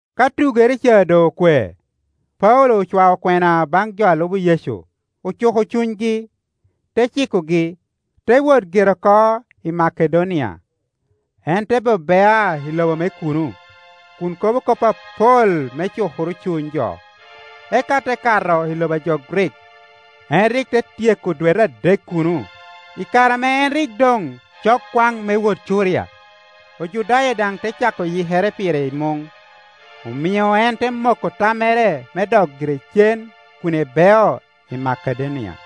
Ka tugere ca doŋ okwe, Paulo ocwao kwena baŋ jo a lubo Yecu, Ocuko cunygi, te cikogi, te wot gire oko i Makedonia. En te be bea i lobo me kuno, kun kobo kop apol me cukoro cuny jo, eka te kato i lobo a jo Grik. En rik te tyeko dwete adek kuno; i kare ame en rik doŋ cok kwaŋ me wot Curia, Ojudaya daŋ te cako yikere pire i muŋ, omio en te moko tammere me dok gire cen kun ebeo i Makedonia.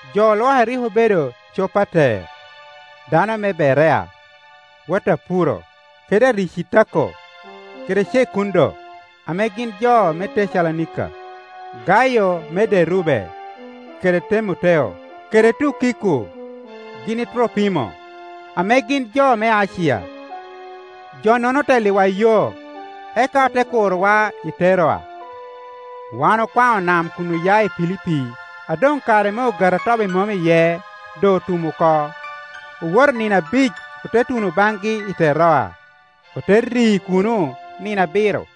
Jo olwoke rik obedo Copater, dano me Berea, wot a Puro, kede Aricitako, kede Cekundo, ame gin jo me Tecalonika, Gayo me Derube, kede Temoteo, kede Tukiko gin i Tropimo ame gin jo me Acia. Jo-nono otelliwa yo, eka ote kurowa i Teroa. Wan okwaŋo nam kun oya i Pilipi a doŋ kare me Ogati a Tobi Mom iye doŋ otum oko, owoto nino abic ote tuno baŋgi i Teroa, ote ri kuno nino abiro.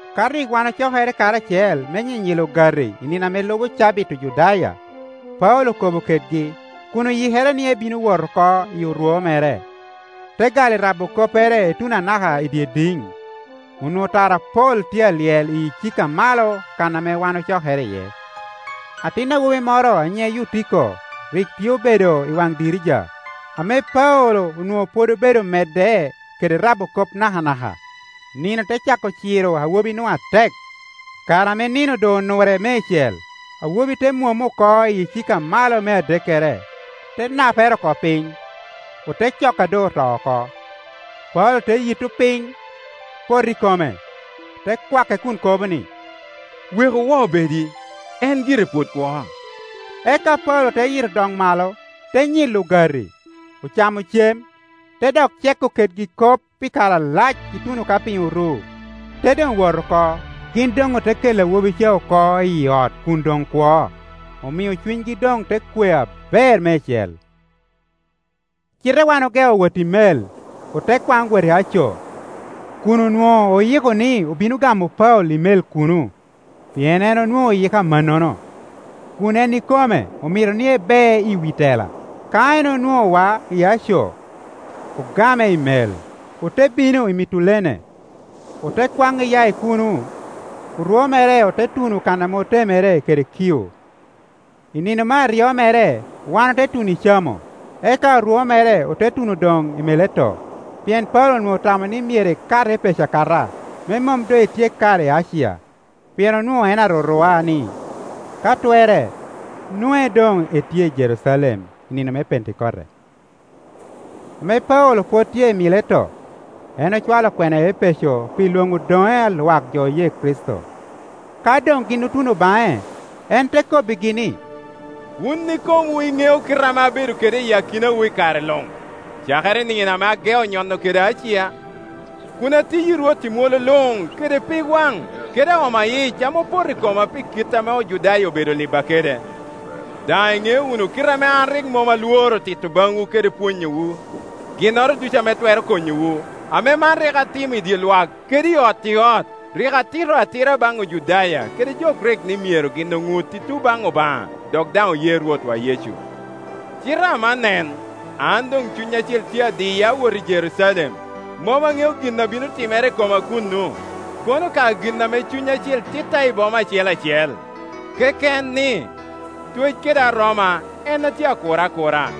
Ka rik wan ocokere karacel me nyinyilo ogati i nino ame lubo cabit Ojudaya, Paulo okobo kedgi, kun oyikere ni ebino wot oko i orwo mere, te gal i rabo koppere i tuno anaka i dye idiŋ. Onwoŋo tara apol tye alyel i icika amalo kan a wan ocokere iye. Atin awobi moro a nyiŋe Yutiko rik tye obedo i waŋ dirica. Ame Paulo onwoŋo pwod obedo medde kede rabo kop nakanaka, nino te cako ciro awobinu atek. Kare ame nino doŋ onure meicel, awobi te mwomo oko i icika a malo me adekkere, te napere oko piny, ote coko a doŋ oto oko. Paulo te yitto piny, poto i kome, te kwake kun kobo ni, “Weku woo bedi. En gire pwod kwo.” Eka Paulo te yito dok malo, te nyilo ogati; ocamo cem, te dok ceko kedgi kop pi kare alac ituno ka piny oru, te doŋ wot oko. Gin doŋ ote kelo awobi caoko i ot kun doŋ kwo, omio cunygi doŋ te kwe aber meicel. Cite wan ogeo wot i mel, ote kwaŋ wot i Aco, kun onwoŋo oyiko ni obino gamo Paulo i mel kuno, pien en onwoŋo oyiko amannono, kun en ikome omito ni ebe i wi tela. Ka en onwoŋowa i Aco, ogame i mel, ote bino i Mitulene. Ote kwaŋ iya i kuno, orwo mere ote tuno kan ame otemere kede Kio. I nino me aryo mere wan ote tuno i Camo, eka orwo mere ote tuno doŋ i Mileto. Pien Paulo onwoŋo otamo ni myero ekat Epeco akata, me mom doŋ etyek kare i Acia; pien onwoŋo en arurua ni, ka twerre, nwoŋe doŋ etye i Jerucalem i nino me Pentekote. Ame Paulo pwod tye i Mileto, en ocwalo kwena i Epeco pi lwoŋo odoŋe a lwak jo oye Kricito. Ka doŋ gin otuno baŋe, en te kobbigi ni, “Wun ikomwu iŋeo kite ame abedo kede i akinawu i kare luŋ, cakere i nino ame ageo nyono kede Acia, kun atiyi Rwot i mwolo luŋ kede pig waŋ kede aoma yic ame opoto i koma pi kit ame Ojudaya obedo liba kede. Daŋ iŋeo wunu kite ame an rik mom alworo tito baŋwu kede pwonyowu ginnoro ducu ame twero konyowu, ame man rik atimo i dye lwak kede i ot i ot. Rik atito atira baŋ Ojudaya kede jo Grik ni myero gin oŋut i tun baŋ Obaŋa dok daŋ oye Rwotwa Yecu. Cite aman, nen, an doŋ Cuny Acil tye adiya awot i Jerucalem; mom aŋeo gin a bino timere i koma kuno, kono ka gin ame Cuny Acil titta i boma acel acel, keken, ni, twec kede aroma en ame tye akura akura.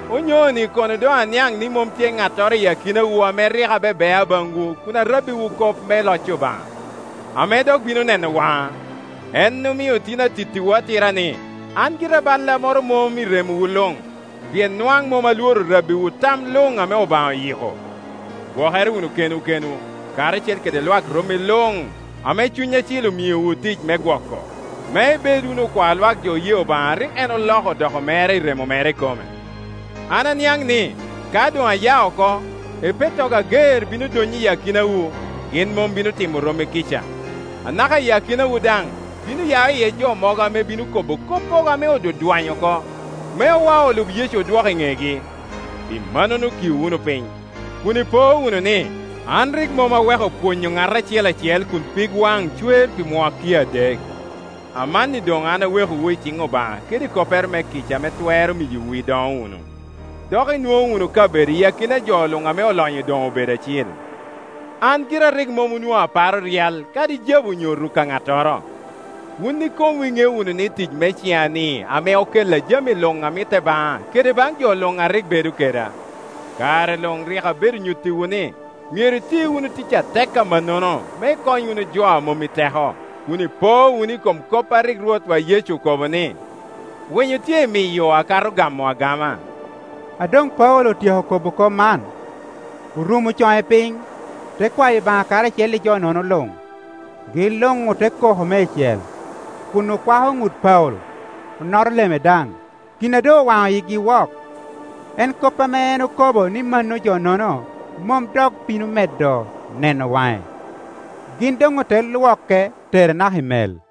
“Onyoni kono doŋaniaŋ ni mom tye ŋattoro i akinawu ame rik abebea baŋwu kun arabbiwu kop me loc Obaŋa, ame dok bino neno waŋa. En omio tin atittiwu atira ni, an gira balla moro mom i remowu luŋ, pien nwaŋ mom alworo rabbiwu tam luŋ ame Obaŋa oyiko. Gwokere wunu kenwu kenwu, karacel kede lwak romi luŋame Cuny Acil omiowu tic me gwoko, me ibed wunu okwa lwak jo oye Obaŋa a rik en oloko odoko mere i remo mere ikome. An aniaŋ ni, ka doŋaya oko, epettogo ager bino donyo i akinawu, gin mom bino timo romi kica. Anaka i akinawu daŋ, bino ya iye jo mogo ame bino kobo koppogo ame odwadwanyo oko, me owa olub Yecu odwok i ŋegi. Pi mannono kiu wunu piny, kun ipo wunu ni, an rik mom aweko pwonyo ŋat acel acel kun pig waŋ cwer pi mwakki adek. Amanni doŋ an awekowu i ciŋ Obaŋa kede i koppere me kica ame twero miyowu idoŋo wunu, dok inwoŋo wunu kabedowu i akina jo luŋ ame olonyo doŋ obedo acil. An gira rik mom onwoŋo aparo ryal kadi jabu onyo ruk a ŋattoro. Wun ikomwu iŋeo wunu ni tic me cina-ni ame okella jami luŋ a mitte baŋa kede baŋ jo luŋa rik bedo keda. Kare luŋrik abedo nyuttiwu ni myero iti wunu tic atek amannono me ikony wunu jo a mom i teko, kun ipo wunu i kom kop a rik Rwotwa Yecu okobo ni, ‘Winyo tye i miyo akato gamo agama.’” A doŋ Paulo otyeko kobo kop man, orumo coŋe piny, te kwayo Obaŋa karacel i jo-nono luŋ. Gin luŋote koko meicel, kun okwako ŋut Paulo, onoto leme daŋ. Gin a doŋowaŋo yigi wok, en kop ame en okobo ni mano jo-nono mom dok bino medo neno waŋe. Gin doŋote lwoke tere naka i mel.